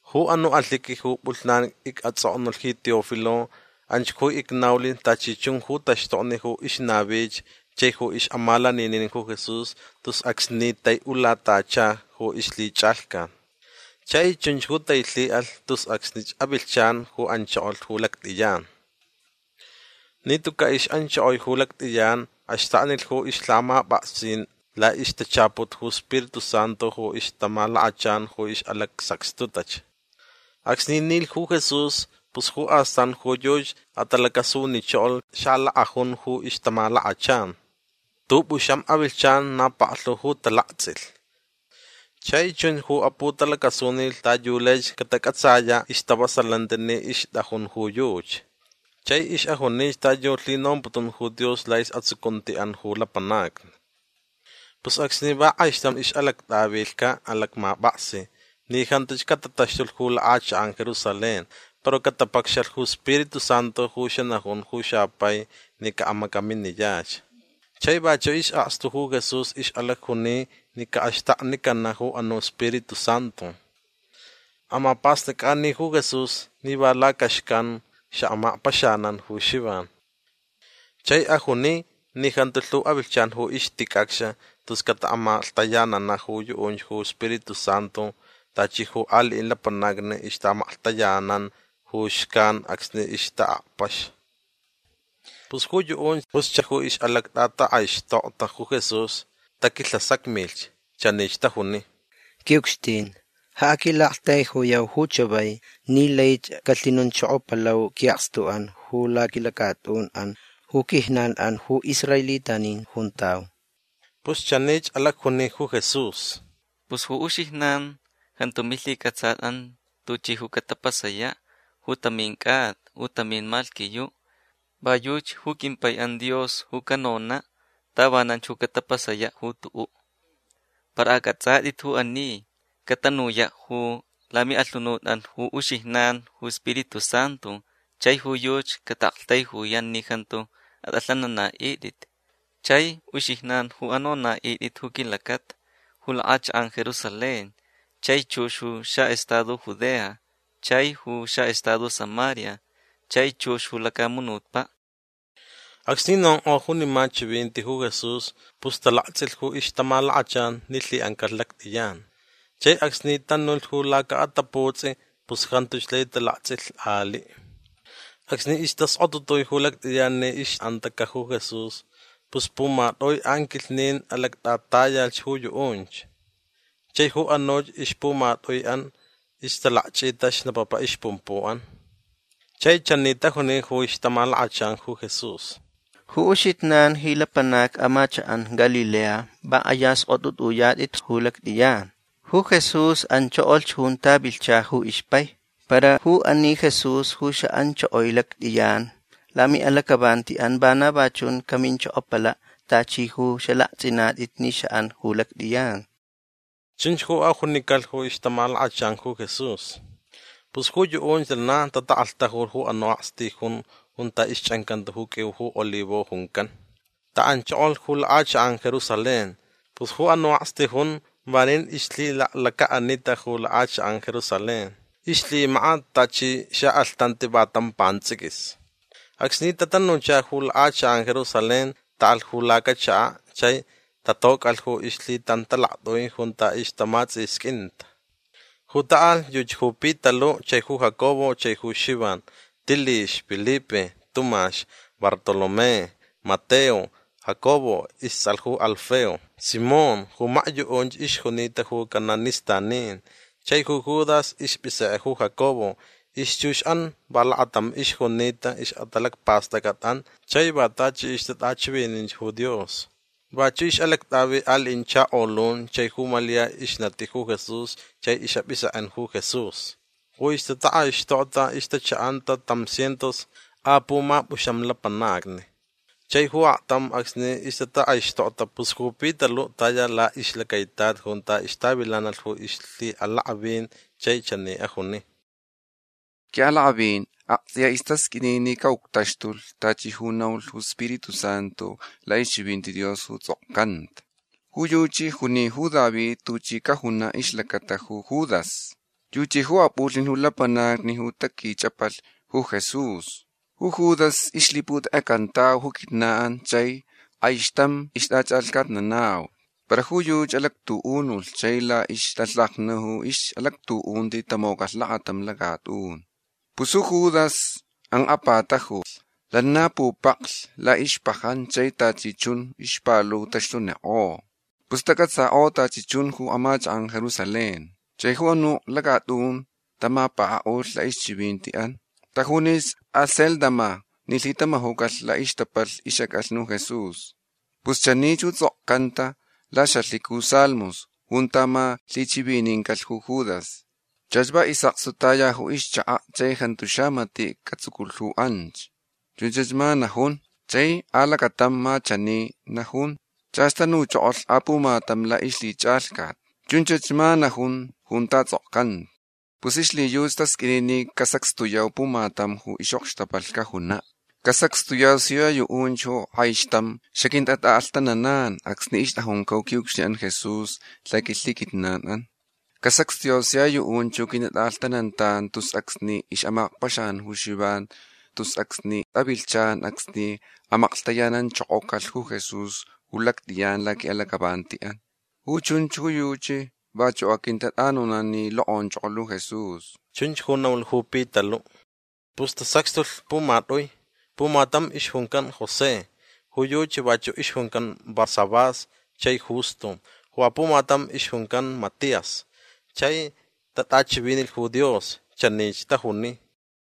Ju anu' alhiqui ju p'ulhnan ic'ats'oknulh ji Teófilo anch ju icnaulh tachi chun ju taxtokni ju ixnavich chai ju ix'amalaninin ju Jesús tus acsni tai'ulatacha ju ixlhich'alhcat. Chai chunch ju tailhi'alh tus acsnich avilhchan ju anchokolh ju lact'iyan. Ni tuca' ix'anchokoi ju lact'iyan axtaknilh ju ixlhamap'aksin la'ixtachaput ju Spiritu Santu ju ixtamalakachan ju ix'alacsacxtutach. Acsni nilh ju Jesús pus ju astan ju yuchi atalacasunichokolh xalak'ajun ju ixtamalakachan. T'up'uxam avilhchan na paklhu ju talakts'ilh. Chai chun ju aputalacasunilh ta yu laich catac'atsaya' istavasalanti ni ixt'ajun ju yuchi. Chai ix'ajunich ta yu lhinomputun ju Dios la'is'atsucunti'an ju lapanacni. Pus acsni va k'aixtam ix'alact'atavilhca' alacmap'aksi ni jantuch catataxtulh ju lak'achak'an Jerusalén para catapacxalh ju Spiritu Santu ju xanajun ju xapai ni ca'amacaminiyach. Chai vachu' is'akstu ju Jesús ix'alacjuni ni ca'axtaknicana' ju anu' Spiritu Santu. Amap'ast'ac'ani ju Jesús ni va lacaxcan xa'amakpaxanan ju Xivan. Chai ajuni ni jantu lhu avilhchan ju ixtic'acx tus cata'amaklhtayanana' ju yu'unch ju Spiritu Santu tachi ju ali'in lapanacni ixta'amaklhtayanan ju xcan acsni ixta'akpax. Pus ju yu'unch ju ix'alact'atak'aixtokta ju Jesús taquilhasacmich. Chanich tajuni: ―Qui'ucxtin ja aquila'aktaijuyau ju chavai ni laich calhinonchokopalau qui'akstu'an ju laquilacat'un'an ju quijnan'an ju israelitanin juntau. Pus chanich alacjuni ju Jesús: ―Pus ju uxijnan jantu milhic'atsat'an tuchi ju catapasaya' ju tamin c'ata u tamin malhquiyu'. Va yuchi ju quimpai'an Dios ju canona' tavananch ju catapasaya' ju tu'u'. Para ac'ats'at'it ju ani. Catanuya' ju lami'alhunut'an ju uxijnan ju Spiritu Santu chai ju yuchi cata'aktaijuyan ni jantu at'alhanana'it'it. Chai uxijnan ju anona'it'it ju quilacata ju lak'achak'an Jerusalén chai chux ju xa'estado Judea chai ju xa'estado Samaria chai chux ju lacamunutpa'. Acsni nonk'o junima chivinti ju Jesús pus talakts'ilh ju ixtamalakachan ni lhi'ancalh lact'iyan. Chai acsni tanulh ju laca'ataputs'i pus jantuch lai talakts'ilh ali'. Acsni istaskotutui ju lact'iyan ni ix'antaca' ju Jesús pus pumat'ui anquilhnin alact'atayalhch ju yu'unch. Chai ju anuch ixpumat'ui'an ixtalakch'ita xnapapa ixpumpu'an. Chai chani tajuni ju ixtamalakachan ju Jesús: ―Ju uxijnan ji lapanacni amachak'an Galilea va k'aya sk'ot'ut'uyat'itch ju lact'iyan. Ju Jesús anchokolh junta vilhcha ju ixpai. Para ju ani Jesús ju xa'anchokoi lact'iyan lami'alac'avanti'an vana va chunch caminchokopala' tachi ju xalakts'inat'it ni xa'an ju lact'iyan. ―Chunch ju ajunicalh ju ixtamalakachan ju Jesús. Pus ju yu'unch lana tatak'alhtajulh ju anu' akstijun junta ixch'ancanta ju q'uiu ju olivo juncan. Ta'anchokolh ju lak'achak'an Jerusalén. Pus ju anu' akstijun vanin ixlhilaklaca'anita ju lak'achak'an Jerusalén. Ixlhimakat tachi xa'alhtanti va tam pants'iquis. Acsni tatanucha ju lak'achak'an Jerusalén ta'alh ju lacachaka' chai tatoc'alh ju ixlhitantalact'ui junta ixtamats'isq'uinta. Ju ta'alh yuchi ju Pitalu' chai ju Jacobo chai Xivan, Tilix, Pilipe, Tumax, Bartolomé, Mateo, Jacobo ists'alh ju Alfeo, Simón ju makyu'unch ixjunita ju cananistanin, chai ju Judas isp'isek'e ju Jacobo. Ixchux'an va lakatam ixjunita ix'atalacpast'ac'at'an chai va tachi ixtat'achivinin ju Dios. Vachu' ix'alact'avi ali'in chakolun chai ju Malia ixnati ju Jesús chai ix'ap'isek'en ju Jesús. Ju ixtatak'aixtokta ixtacha'anta tam cientos a pumap'uxam lapanacni. Chai ju aktam acsni ixtatak'aixtokta pus ju Pitalu' taya la'ixlacaitat junta ixtavilanalh ju lhi'alak'avin chai chani ajuni: ―Qui'alak'avin akts'iya istasq'uini ni ca'uctaxtulh tachi ju naulh ju Spiritu Santu la'ixchivinti Dios ju ts'okcanta. Ju yuchi juni ju David tuchi cajuna' ixlacata ju Judas. Yuchi ju ap'ulhnilh ju lapanacni ju taquich'apalh ju Jesús. Ju Judas ixlhiputek'ecantau ju quijnan chai k'aixtam ixt'ach'alhcatnanau. Para ju yuchi alactu'unulh chai la'ixtalhaja ju ix'alactu'unti tamocalh lakatam lacat'un. Pus ju Judas ank'apatajulh. Lana pupaklh ju la'ixpajan chai tachi chun ixpalu taxtunik'o. Pus tac'atsak'o tachi chun ju amachak'an Jerusalén. Chai ju anuch lacat'un tamapaka'ulh la'ixchivinti'an. Tajunich Acéldama ni lhitama'ucalh la'ixtapalh ix'ac'alhni ju Jesús. Pus chanich ju ts'okcanta laxa'alhiqui ju Salmos junta ma lhichivinincalh ju Judas: Chach va is'akstu taya ju ixchaka' chai jantu xamati' catsuculh ju anch. Chunch ma najun. Chai alacatam ma chani najun: Chach tanuchokolh apumatam la'ixlhich'alhcat. Chunch ma najun junta ts'okcanta. Pus ixlhiyuchi tasq'uini ni casacxtuyau pumatam ju ix'okxtapalh cajuna'. Casacxtuyau sia yu'unch ju k'aixtam xaquintat'a'alhtananan acsni ixt'ajunca' ju qui'ucxtin'an Jesús laquilhiquijnan'an. Casacxtuyau sia yu'unch ju quintat'a'alhtanantan tus acsni ix'amakpaxanan ju Xivan tus acsnich avilhchan acsni amaklhtayananchokocalh ju Jesús ju lact'iyan laqui'alac'avanti'an. Ju chunch ju yuchi vachu' aquintat'anonan ni lok'onchokolh ju Jesús. ―Chunch ju naulh ju Pitalu'. Pus tasacxtulh pumat'ui. Pumatam ixjuncan José. Ju yuchi vachu' ixjuncan Barsabás chai Justo. Ju apumatam ixjuncan Matías. Chai tat'achivinilh ju Dios. Chani tajunich: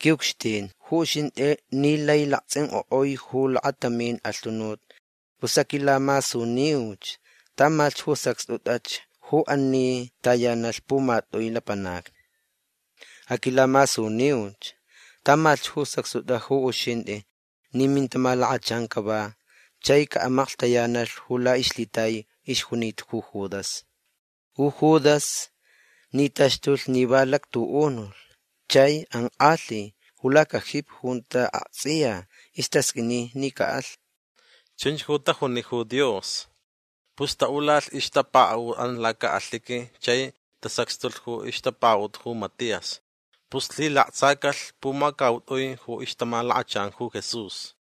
―Qui'ucxtin ju uxint'i ni lai lakts'ink'o'ui ju lakatamin alhunut pus aquilamasuniuch tamalhch ju sacxt'ut'ach ju ani tayanalh pumat'ui lapanacni. Aquilamasuniuch tamalhch ju sacxt'ut'ach ju uxint'i ni mintamalakachan cava chai ca'amaklhtayanalh ju la'ixlhitai ixjunita ju Judas. Ju Judas ni taxtulh ni va alactu'unulh chai ank'alhi ju lacajipi junta akts'iya istasq'uini ni ca'alh. ―Chunch ju tajuni ju Dios. Pus ta'ulalh ixtapaka'ut'an laca'alhiqui chai tasacxtulh ju ixtapaka'ut ju Matías. Pus lhilaktsacalh pumacaut'ui ju ixtamalakachan ju Jesús.